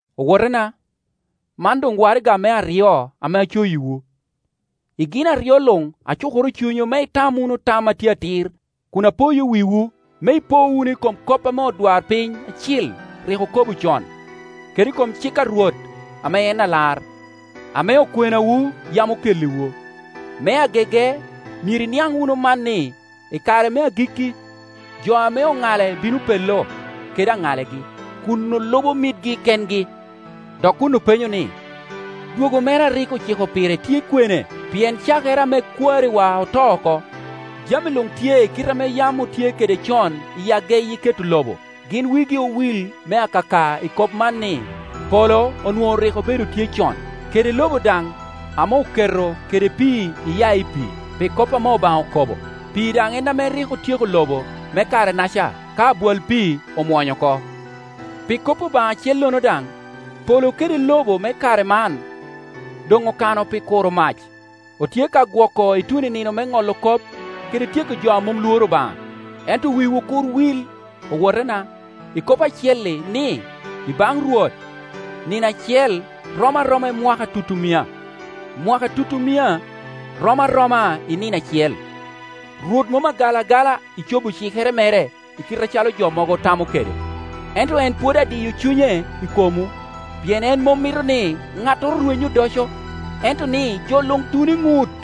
Owotena, man doŋ waraga me aryo ame acoyiwu. I gin aryo luŋ acukoro cunywu me itam wunu tam a tye atir, kun apoyo wiwu, me ipo wunu i kom kop ame odwarpiny acil rik okobo con, kede i kom cik a Rwot ame en Alar, ame okwenawu yam okelliwu. #Jud. 18Me agege, myero iniaŋ wunu man ni, i kare me agikki jo ame oŋale bino pello kede aŋalogi, kun olubo mitgi kengi, dok kun openyo ni, “Dwogo mere a rik ociko pire tye kwene? Pien cakere ame kwariwa oto oko, jami luŋ tye i kite ame yam otye kede con i ageyi keto lobo.” Gin wigi owil me akaka i kop man ni, polo onwoŋo rik obedo tye con, kede lobo daŋ ame oketo kede pii iya i pii, pi kop ame Obaŋa okobo. Pii daŋ en ame rik otyeko lobo me kare-naca ka abwal pii omwonyo oko. Pi kop Obaŋa acellono daŋ, polo kede lobo me kare man doŋ okano pi kuro mac; otye ka gwoko ituno i nino me ŋolo kop kede tyeko jo a mom lworo Obaŋa. Ento wiwu kur wil, owotena, i kop acel-li, ni, i baŋ Rwot nino acel rom aroma i mwaka tutumia, mwaka tutumia rom aroma i nino acel. Rwot mom agal agala i cobo cikere mere i kite acalo jo mogo tamo kede, ento en pwod adiyo cunye i komwu, pien en mom mito ni ŋattoro rweny odoco, ento ni jo luŋ tun i ŋut.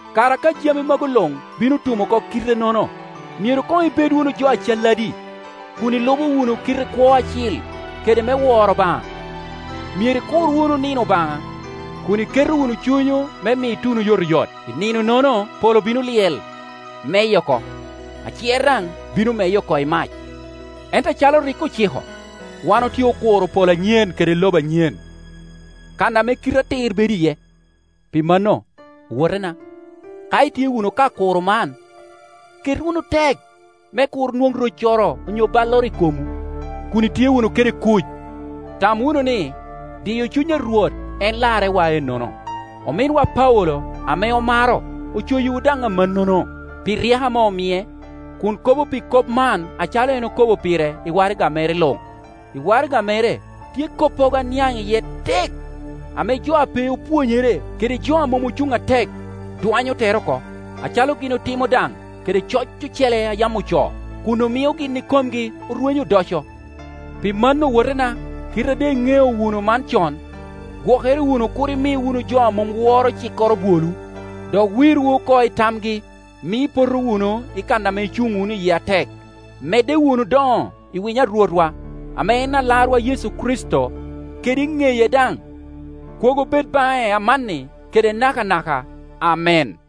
Kara ka jami magu luŋ bino tum oko kite-nono, myero koŋ ibed wunu jo acalladi, kun ilubo wunu kite kwo acil kede me woro Obaŋa? Myero ikur wunu nino Obaŋa, kun iketo wunu cunywu me mi tun oyotoyot. I nine-nono polo bino lyel, meye oko, acer daŋ bino meye oko i mac. Ento acalo en rik ociko, wan otye okuro polo anyen kede lobo anyen, kan ame kite atir bedo iye. Pi mano, owotena, ka itye wunu ka kuro man, ket wunu tek me kur nwoŋ roccoro onyo balloro i komwu, kun itye wunu kede kuc. Tam wunu ni, diyo cuny a Rwot en larrewa ennono. Ominwa Paulo ame omaro ocoyiwu daŋ amannono, pi ryeko ame omie, kun kobo pi kop man acalo en kobo pire i waraga mere luŋ. I waraga mere tye koppogo a niaŋ iye tek, ame jo a pe opwonyere, kede jo a mom ocuŋ atek, dwanyo tere oko, acalo gin otimo daŋ kede coc ocele a yam ocoo, kun omio gin ikomgi orwenyo odoco. Pi mano, owotena, kite a doŋ iŋeo wunu man con, gwokere wunu kur imi wunu jo a mom woro cikkoro bwolwu, dok wirwu oko i tamgi, mio ipoto wunu i kan ame icuŋ wunu iye atek. Medde wunu doŋo i winyo a Rwotwa, ame en Alarwa Yecu Kricito, kede i ŋeye daŋ. Kwogo bed baŋe amanni kede nakanaka. Amen.